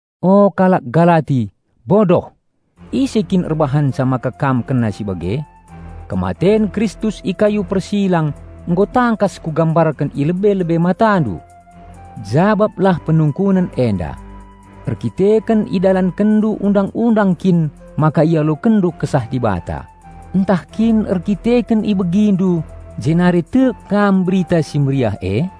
O kalak Galati bodoh! Ise kin erbahanca maka kam kena si bage? Kematen Kristus i kayu persilang nggo tangkas kugambarken i lebe-lebe matandu! Jabaplah penungkunen enda: Erdandanken idalankenndu Undang-undang kin maka ialokenndu Kesah Dibata, ntah kin erdandanken ibegindu jenari tek kam Berita Si Mehuli e?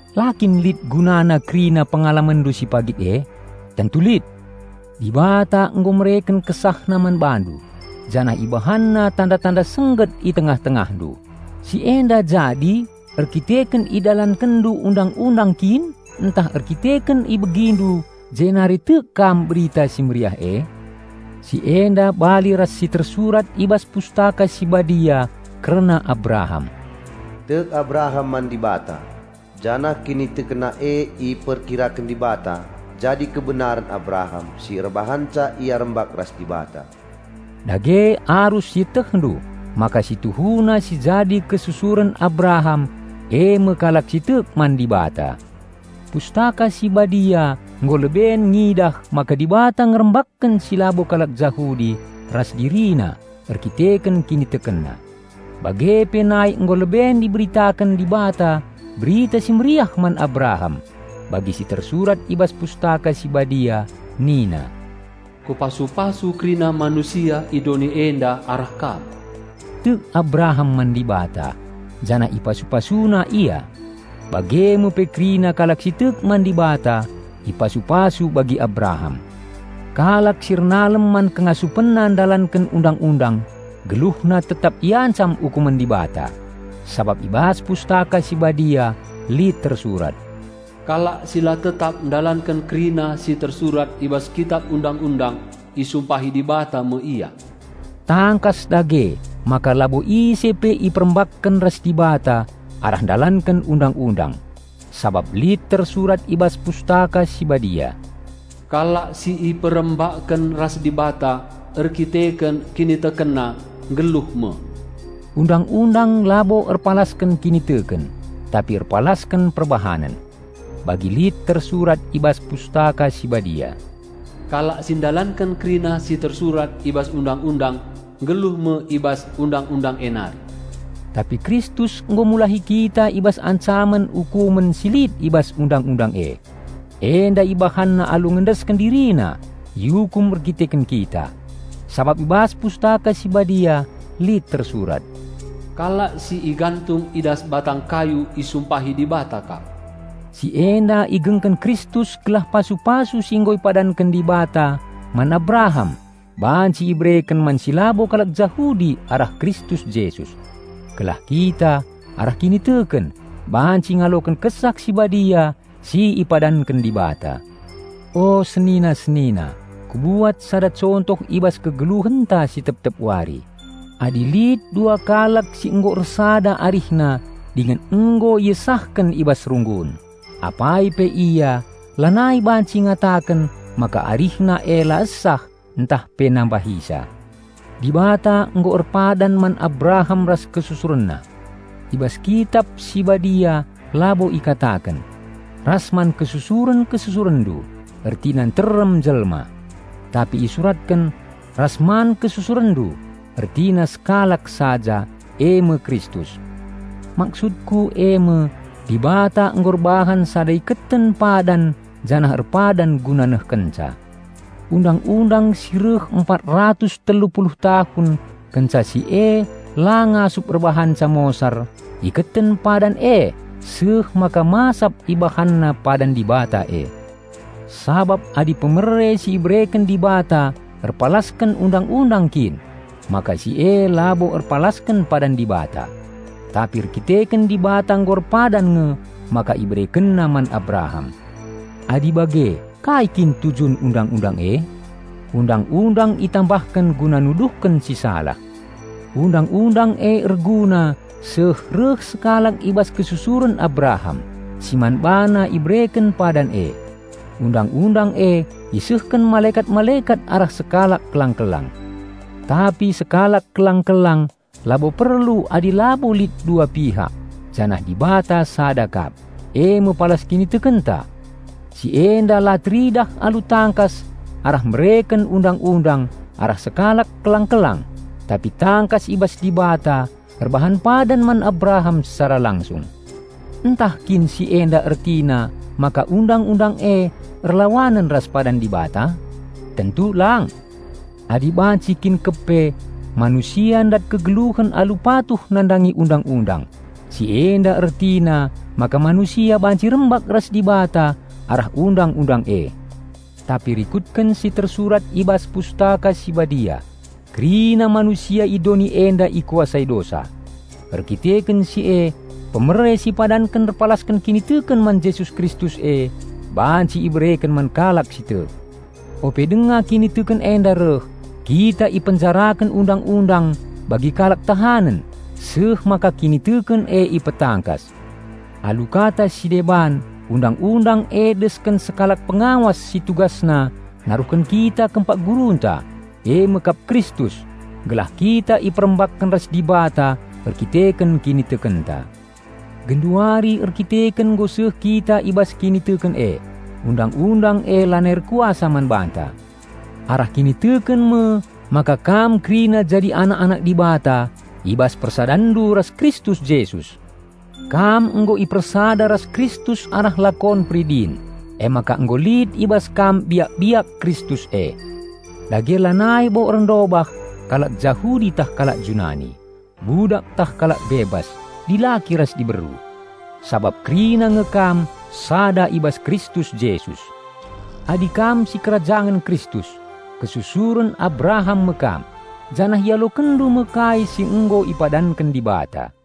La kin lit gunana kerina pengalamenndu si pagit e? Tentu lit! Dibata nggo mereken KesahNa man bandu janah IbahanNa tanda-tanda sengget i tengah-tengahndu: si enda jadi erdandanken idalankenndu Undang-undang kin ntah erdandanken ibegindu jenari tek kam Berita Si Mehuli e? Si enda bali ras si tersurat i bas Pustaka Si Badia kerna Abraham, "Tek Abraham man Dibata, janah kinitekenna e irkira Dibata jadi kebenaren Abraham si erbahanca ia rembak ras Dibata." Dage arus ietehndu maka si tuhuna si jadi kesusuren Abraham eme kalak si tek man Dibata. Pustaka Si Badia nggo leben ngidah maka Dibata ngerembakken si labo kalak Jahudi ras DiriNa erdandanken kinitekenna. Bage pe nai nggo leben iberitaken Dibata Berita Si Mehuli man Abraham bagi si tersurat i bas Pustaka Si Badia nina, "Kupasu-pasu kerina manusia i doni enda arah kam." Tek Abraham man Dibata, janah ipasu-PasuNa ia. Bage me pe kerina kalak si tek man Dibata ipasu-pasu bagi Abraham. Kalak si ernalem man kengasupenna ndalanken Undang-undang geluhna tetap iancam ukumen Dibata. Sabap i bas Pustaka Si Badia lit tersurat, "Kalak si la tetap ndalanken kerina si tersurat i bas Kitap Undang-undang, isumpahi Dibata me ia!" Tangkas dage maka labo ise pe iperembakken ras Dibata arah ndalanken Undang-undang; sabap lit tersurat i bas Pustaka Si Badia, "Kalak si iperembakken ras Dibata erdandanken kinitekenna, nggeluh me." Undang-undang labo erpalasken kiniteken, tapi erpalasken perbahanen. Bagi lit tersurat i bas Pustaka Si Badia, "Kalak si ndalanken kerina si tersurat i bas Undang-undang nggeluh me i bas Undang-undang e nari." Tapi Kristus nggo mulahi kita i bas ancamen ukumen si lit i bas Undang-undang e. Enda IbahanNa alu ngendesken DiriNa iukum erdandanken kita. Sabap i bas Pustaka Si Badia lit tersurat, "Kalak si igantung i das batang kayu isumpahi Dibata kap." Si enda igengken Kristus gelah pasu-pasu si nggo ipadanken Dibata man Abraham banci ibereken man si labo kalak Jahudi arah Kristus Jesus. Gelah kita, arah kiniteken, banci ngaloken Kesah Si Badia si ipadanken Dibata. O senina-senina, kubuat sada contoh i bas kegeluhenta si tep-tep wari: Adi lit dua kalak si nggo ersada arihna dingen nggo iesahken i bas runggun, apai pe ia lanai banci ngataken maka arihna e la esah ntah pe nambahisa. Dibata nggo erpadan man Abraham ras kesusurenna. I bas Kitap si Badia labo ikataken, "ras man kesusuren-kesusurenndu," ertina nterem jelma. Tapi isuratken, "ras man kesusurenndu," ertina sekalak saja, eme Kristus. Maksudku eme: Dibata nggo erbahan sada iketen padan janah erpadan guna nehkenca. Undang-undang si reh empat ratus telu puluh tahun kenca si e la ngasup erbahanca mosar iketen padan e seh maka masap ibahanna padan Dibata e. Sabap adi pemere si ibereken Dibata erpalasken Undang-undang kin, maka si e labo erpalasken padan Dibata. Tapi erdandanken Dibata nggo erpadan nge maka IberekenNa man Abraham. Adi bage, kai kin tujun Undang-undang e? Undang-undang itambahken guna nuduhken si salah. Undang-undang e erguna seh reh sekalak i bas Kesusuren Abraham, si man BaNa ibereken padan e. Undang-undang e isehken malekat-malekat arah sekalak kelang-kelang. Tapi sekalak kelang-kelang labo perlu adi labo lit dua pihak; janah "Dibata sada kap," eme palas kinitekenta. Si enda la teridah alu tangkas arah mereken Undang-undang arah sekalak kelang-kelang, tapi tangkas i bas Dibata erbahan padan man Abraham secara langsung. Ntah kin si enda ertina maka Undang-undang e erlawanen ras padan Dibata? Tentu lang! Adi banci kin kepe manusia ndat kegeluhen alu patuh nandangi Undang-undang, si enda ertina maka manusia banci rembak ras Dibata arah Undang-undang e. Tapi rikutken si tersurat i bas Pustaka Si Badia kerina manusia i doni enda ikuasai dosa; erkiteken si e pemere si ipadanken erpalasken kiniteken man Jesus Kristus e banci ibereken man kalak si tek. Ope denga kiniteken enda reh, kita ipenjaraken Undang-undang bagi kalak tahanen, seh maka kiniteken e ipetangkas. Alu kata si deban Undang-undang e desken sekalak pengawas si tugasna naruhken kita kempak gurunta, eme kap Kristus, gelah kita iperembakken ras Dibata erdandanken kinitekenta. Genduari erdandanken nggo seh kita i bas kiniteken e, Undang-undang e lanai erkuasa man banta. Arah kiniteken me maka kam kerina jadi anak-anak Dibata i bas persadanndu ras Kristus Jesus. Kam nggo ipersada ras Kristus arah lakon peridin, emaka nggo lit i bas kam biak-biak Kristus e. Dage lanai bo erndobah kalak Jahudi tah kalak Junani, budak tah kalak bebas, dilaki ras diberu. Sabap kerina nge kam sada i bas Kristus Jesus. Adi kam sikerajangen Kristus, kesusuren Abraham me kam, janah ialokenndu me kai si nggo ipadanken Dibata.